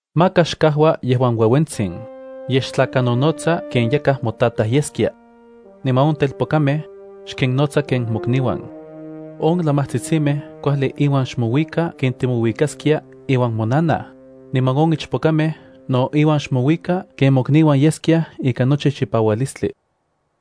Maka xkajua yejuan ueuentsin, yej xtlakanonotsa ken yakaj motataj yeskia. Niman on telpokamej, xkinnotsa ken mokniuan. On lamajtsitsimej kuajli inuan xmouika ken timouikaskiaj iuan monanaj, niman on ichpokamej no inuan xmouika ken mokniuan yeskiaj ikan nochi chipaualistli.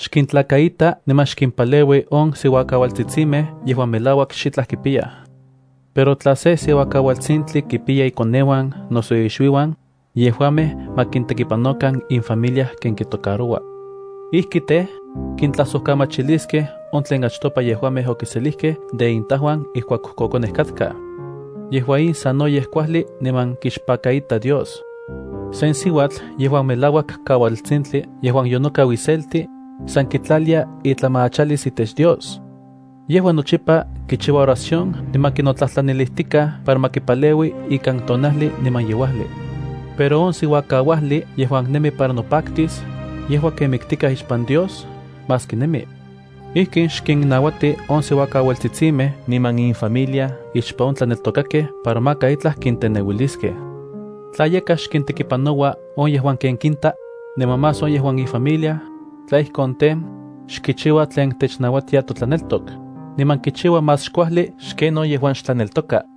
Xkintlakaita niman xkimpaleui on siuakaualtsitsimej yejuan melauak xitlaj kipiyaj. Pero tla sen siuakaualtsintli kipiya ikoneuan noso ixuiuan, yejuamej ma kintekipanokan infamilia ken kitocaroua. Ijki tej, kintlajsojkamachiliskej on tlen achtopa yejuamej okiselijkej de intajuan ijkuak kojkonej katkaj. Yejua in sanoyej kuajli niman kixpakaita Dios. Sen siuatl yejuan melauak kaualtsintli yejuan yonokau iselti, san kitlalia itlamachalis itech Dios. Yejua nochipa kichiua oración niman kinotlajtlanilijtikaj para ma kipaleui ikan tonajli niman yeuajli. Pero on siuakauajli yejuan nemi para nopaktis, yejua ken miktikaj ixpan Dios maski nemi. Ijkin xkinnauati on siuakaualtsitsimej niman infamilia ixpan on tlaneltokakej para maka itlaj kinteneuiliskej. Tla yakaj xkintekipanoua on yejuan ken kinta, niman más on yejuan ifamilia, tla ijkon tej, xkichiua tlen technauatia totlaneltok, niman kichiua más xkuajli xken on yejuan xtlaneltoka.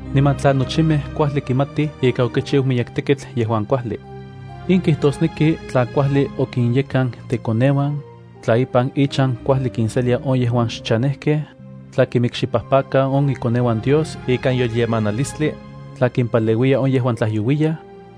niman tla nochimej kuajli kimatij ika okichiu miyek tekitl yejuan kuajli. In kijtosneki tla kuajli okinyekan ikoneuan, tla ipan ichan kuajli kinselia on yejuan xchanejkej, tla kinmikxipajpaka on ikoneuan Dios ikan yolyemanilistli, tla kimpaleuiya on yejuan tlajyouiyaj,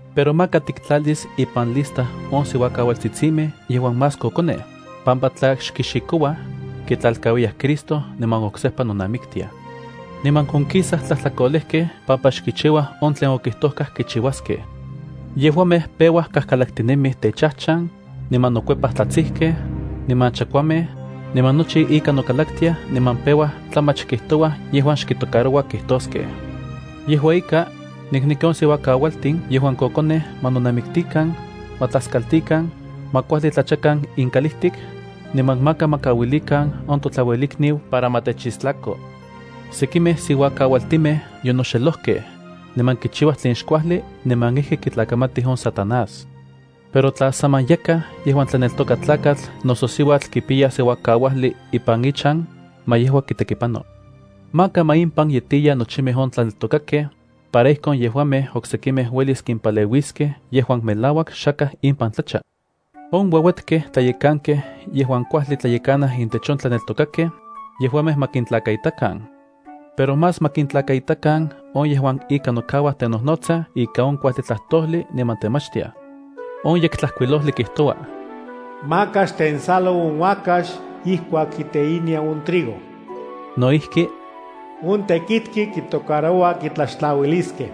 Pero maka tiktlalis ipan lista on siuakaualtsitsimej yejuan más kokonej, pampa tla xkixikouaj, kitlalkauiyaj Cristo niman oksejpa nonamiktiaj. Niman onkisaj tlajtlakolejkej pampa xkichiuaj on tlen okijtojkaj kichiuaskej. Yejuamej peuaj kajkalaktinemij techajchan, niman nokuepaj tlatsijkej, niman chakuamej, niman nochi ika nokalaktiaj niman peua tlamach kijijtouaj yejuan xkitocaroua kijtoskej. Yejua ika, nikneki on siuakaualtin yejuan kokonej ma nonamiktikan, ma tlaskaltikan, ma kuajli tlachakan inkalijtik, niman maka ma kauilikan on totlauelikniu para ma techistlako. Sekimej siuakaualtin yonoxelojkej, niman kichiuaj tlen xkuajli niman ijki kitlakamatij on Satanás. Pero tla saman yakaj yejuan tlaneltoka tlakatl noso siuatl kipiya siuakauajli ipan ichan, ma yejua kitekipano. Maka ma impan yetiya nochimej on tlaneltokakej, para ijkon yejuamej oksekimej uelis kimpaleuiskej yejuan melauak xakaj impan tlacha. On ueuetkej tlayekankej yejuan kuajli tlayekanaj intech on tlaneltokakej, yejuamej ma kintlakaitakan. Pero más ma kintlakaitakan on yejuan ika nokauaj tenojnotsaj ika on kuajli tlajtojli niman temachtiaj. On Yektlajkuilojli kijtoua: “Maka xtensalo on uakax ijkuak kiteinia on trigo.” No ijki: “On tekitki kitocaroua kitlaxtlauiliskej.”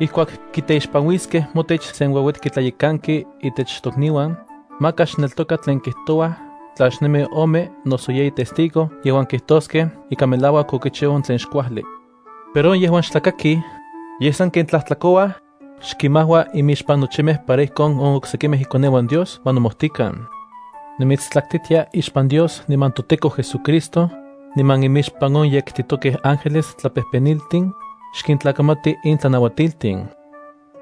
Ijkuak kiteixpanuiskej motech sen ueuetki tlayekanki itech tokniuan, maka xneltoka tlen kijtouaj tla xnemi ome noso yeyi testigo yejuan kijtoskej ika melauak okichiu on tlen xkuajli. Pero on yejuan xtlakakij, yej sanken tlajtlakouaj, xkinmajua imixpan nochimej para ijkon on oksekimej ikoneuan Dios ma nomojtikan. Nimitstlaktitia ixpan Dios niman toTEKO JesuCristo, niman imixpan on yektitokej ángeles tlatlapejpeniltin, xkintlakamati in tlanauatiltin.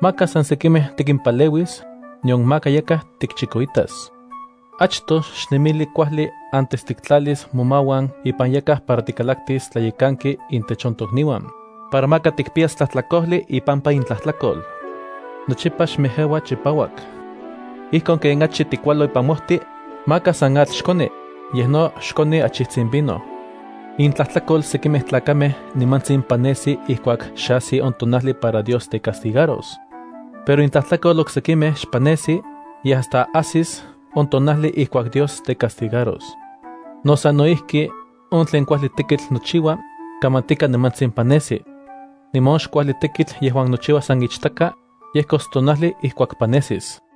Maka san sekimej tikimpaleuis, nion maka yakaj tikchikoitas. Achtoj xnemili kuajli antes tiktlalis momauan ipan yakaj para tikalaktis tlayekanki intech on tokniuan, para maka tikpiyas tlajtlakojli ipampa itlajtlakol. Nochipa xmejeua chipauak. Ijkon ken achi tikualo ipan mojti, maka san atl xkoni, yej no xkoni achijtsin vino. Intlajtlakol sekimej tlakamej nimantsin panesi ijkuak xe ajsi on tonajli para Dios tecastigaros. Pero intlajtlakol oksekimej xpanesi, yej hasta ajsis on tonajli ijkuak Dios tecastigaros. No sano ijki, on tlen kuajli tekitl nochiua, kamantika nimantsin panesi. Niman on xkuajli tekitl yejuan nochiua san ichtaka, yejkos tonajli ijkuak panesis.